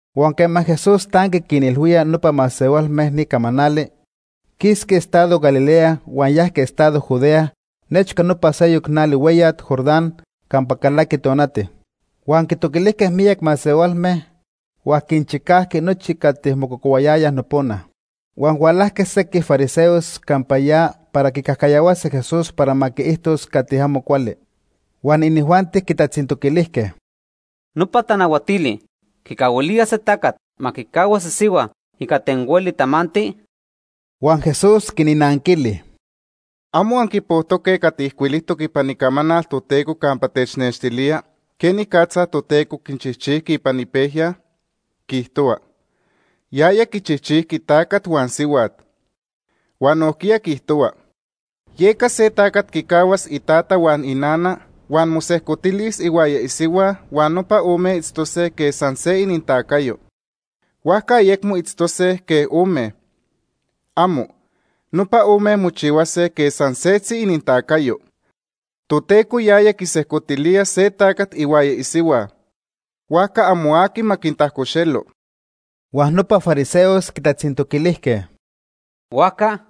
Huan quema Jesús tanqui quinilhuía nopa masehualme ni camanali, quisqui estado Galilea huan yajqui estado Judea nechca nopa seyoc nali hueyat Jordán campa calaqui tonati. Huan quitoquilijque miyac masehualme, huan quinchicajqui nochi cati mococohuayayaj nopona. Huan hualajque sequij fariseos campa ya para quicajcayahuase Jesús para ma quiijtos cati amo cuali. Huan inijuanti quitatzintoquilijque: ―¿Nopa tanahuatili quicahuilía se tacat ma quicahuas isihua ica ten hueli tamanti? Huan Jesús quinnanquili: ―¿Amo anquipojtoque cati ijcuilijtoc ipan Icamanal Toteco campa technextilía quenicatza Toteco quinchijchijqui ipan ipejya? Quiijtohua: ‘Yaya quichijchijqui tacat huan sihuat’. Huan nojquiya quiijtohua: ‘Yeca se tacat quicahuas itata huan inana huan mosejcotilis ihuaya isihua huan nopa ome itztose quej san se inintacayo.’ Huajca ayecmo itztose quej ome. ¡Amo! Nopa ome mochihuase quej san setzi inintacayo. Toteco yaya quisejcotilía se tacat ihuaya isihua; huajca amo aqui ma quintajcoxelo. Huan nopa fariseos quitatzintoquilijque: ―Huajca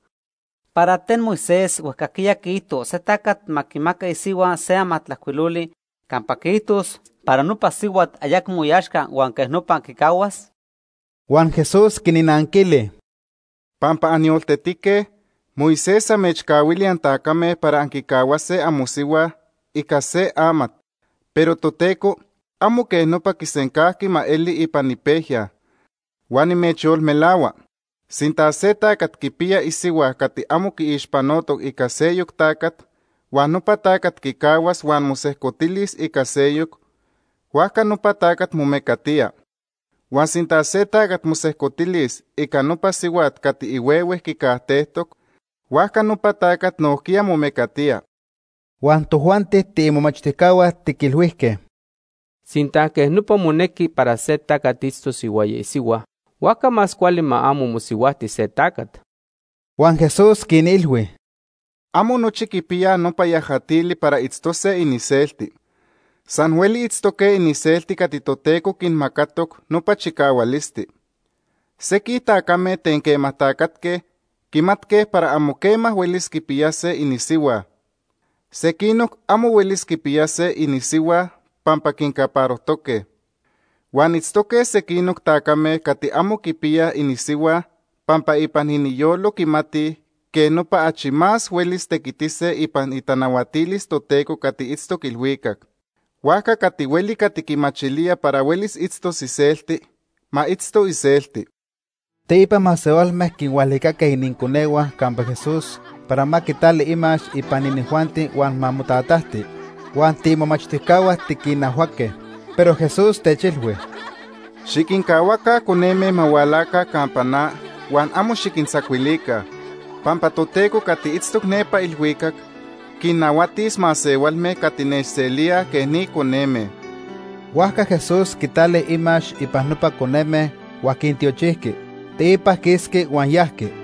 ¿para ten Moisés huejcajquiya quiijto se tacat ma quimaca isihua se amatajcuiloli campa quiijtos para nopa sihuat ayecmo iaxca huan quej nopa quicahuas? Huan Jesús quinnanquili: ―Pampa anyoltetique, Moisés amechcahuili antacame para anquicahuase amosihua ica se amat, pero Toteco amo quej nopa quisencajqui ma eli ipan ipejya. Huan nimechyolmelahua, sinta se tacat quipiya isihua cati amo quiixpanotoc ica seyoc tacat huan nopa tacat quicahuas huan mosejcotilis ica seyoc, huajca nopa tacat momecatía. Huan sinta se tacat mosejcotilis ica nopa sihuat cati ihuehue quicajtejtoc, huajca nopa tacat nojquiya momecatía. Huan tojuanti tiimomachtijcahua tiquilhuijque: ―Sinta quej nopa monequi para se tacat itztos ihuaya isihua, huajca más cuali ma amo mosihuajti se tacat. Huan Jesús quinilhui: ―Amo nochi quipiyaj nopa yajatili para itztose iniselti. San hueli itztoque iniselti cati Toteco quinmacatoc nopa chicahualisti. Sequij tacame ten quema tacatque quimatque para amo quema huelis quipiyase inisihua. Sequinoc amo huelis quipiyase inisihua pampa quincaparojtoque. Huan itztoque sequinoc tacame cati amo quipiyaj inisihua pampa ipan iniyolo quimatij quej nopa achi más huelis tequitise ipan itanahuatilis Toteco cati itztoc ilhuicac. Huajca cati hueli cati quimachilía para huelis itztos iselti, ma itzto iselti. Teipa masehualme quinhualicaque ininconehua campa Jesús para ma quitali imax ipan inijuanti huan ma motatajti. Huan tiimomachtijcahua tiquinajhuaque. Pero Jesús techilhui: ―Xiquincahuaca coneme ma hualaca campa na huan amo xiquintzacuilica, pampa Toteco cati itztoc nepa ilhuicac quinnahuatis masehualme cati nechselíaj quej ni coneme. Huajca Jesús quitali imax ipan nopa coneme huan quintiochijqui, teipa quisqui huan yajqui.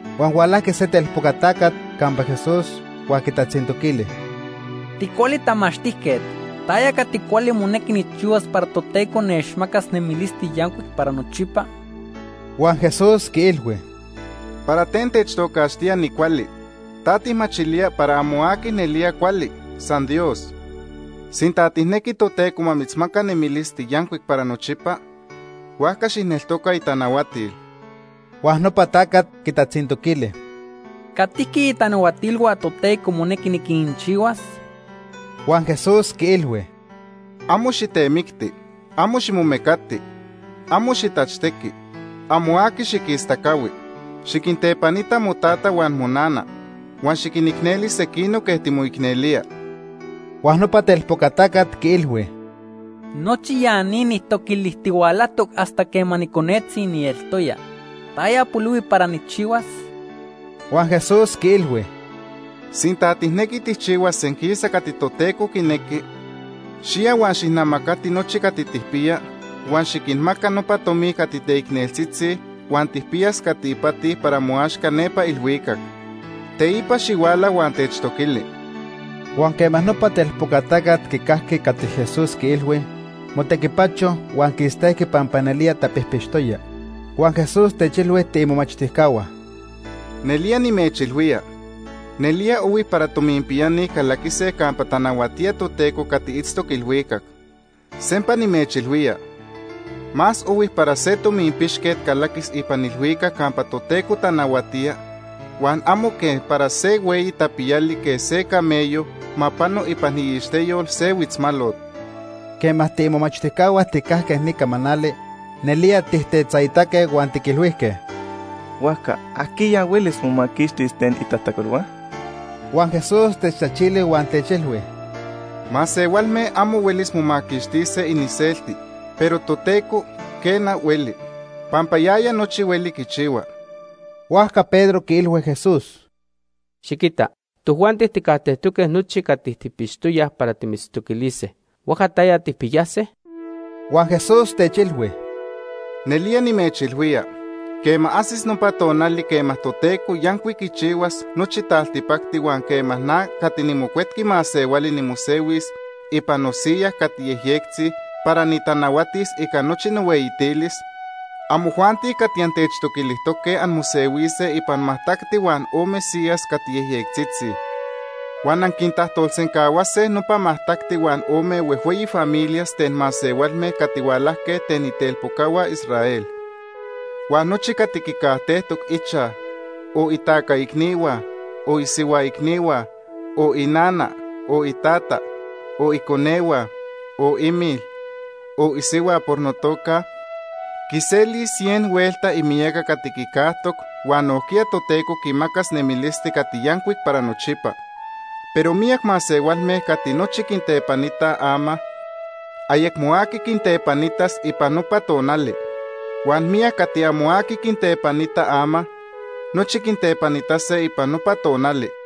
Huan hualajqui se telpoca tacat campa Jesús huan quitatzintoquili: ―Ticuali tamachtijquet, ¿taya cati cuali monequi nijchihuas para Toteco nechmacas nemilisti yancuic para nochipa? Huan Jesús quiilhui: ―¿Para ten techtocaxtía nicuali? ¿Ta tijmachilía para amo aqui nelía cuali, san Dios? Sinta tijnequi Toteco ma mitzmaca nemilisti yancuic para nochipa, huajca xijneltoca itanahuatil. Huan nopa tacat quitatzintoquili: ―¿Catijqui itanahuatilhua Toteco monequi niquinchihuas? Huan Jesús quiilhui: ―Amo xitemicti, amo ximomecati, amo xitachtequi, amo aqui xiquistacahui. Xiquintepanita motata huan monana, huan xiquinicneli sequinoc quej timoicnelía. Huan nopa telpoca tacat quiilhui: ―Nochi ya ni nijtoquilijtihualajtoc hasta quema niconetzi nieltoya. ¿Taya polihui para nijchihuas? Huan Jesús quiilhui: ―Sinta tijnequi tijchihuas senquisa cati Toteco quinequi, xiya huan xijnamacati nochi cati tijpiya huan xiquinmaca nopa tomi cati teicneltzitzi huan tijpiyas cati ipati para moaxca nepa ilhuicac. Teipa xihuala huan techtoquili. Huan quema nopa telpoca tacat quicajqui cati Jesús quiilhui, motequipacho huan quistejqui pampa nelía tapijpixtoya. Huan Jesús techilhui tiimomachtijcahua: ―Nelía nimechilhuía, nelía ohui para tominpiyani calaquise campa tanahuatía Toteco cati itztoc ilhuicac. Sempa nimechilhuía, más ohui para se tominpixquet calaquis ipan ilhuicac campa Toteco tanahuatía huan amo que para se hueyi tapiyali quej se camello ma pano ipan iixteyol se huitzmalot. Quema tiimomachtijcahua tijcajque ni camanali, nelía tijtetzaitaque huan tiquilhuijque: ―Huajca ¿ajquiya huelis momaquixtis ten itajtacolhua? Huan Jesús techtachili huan techilhui: ―Masehualme amo huelis momaquixtise iniselti, pero Toteco, quena, hueli. Pampa yaya nochi hueli quichihua. Huajca Pedro quiilhui Jesús: ―Xiquita, tojuanti tijcajtejtoque nochi cati tijpixtoyaj para timitztoquilise. Huajca ¿taya tijpiyase? Huan Jesús techilhui: ―Nelía nimechilhuía quema ajsis nopa tonali quema Toteco yancuic quichihuas nochi taltipacti huan quema na cati niMocuetqui Masehuali nimosehuis ipan nosiya cati yejyectzi para nitanahuatis ica nochi nohueyitilis, amojuanti cati antechtoquilijtoque anmosehuise ipan majtacti huan ome siyas cati yejyectzitzi. Huan anquintajtolsencahuase nopa majtacti huan ome huejhueyi familias ten masehualme cati hualajque ten itelpocahua Israel. Huan nochi cati quicajtejtoc ichaj, o itaca icnihua, o isihua icnihua, o inana, o itata, o iconehua, o imil, o isihua por notoca Pampa nechneltoca., quiselis cien huelta imiyaca cati quicajtoc huan nojquiya Toteco quimacas nemilisti cati yancuic para nochipa. Pero miyac masehualme cati nochi quintepanitaj ama, ayecmo aqui quintepanitas ipan nopa tonali. Huan miyac cati amo aqui quintepanita ama, nochi quitepanitase ipan nopa tonali.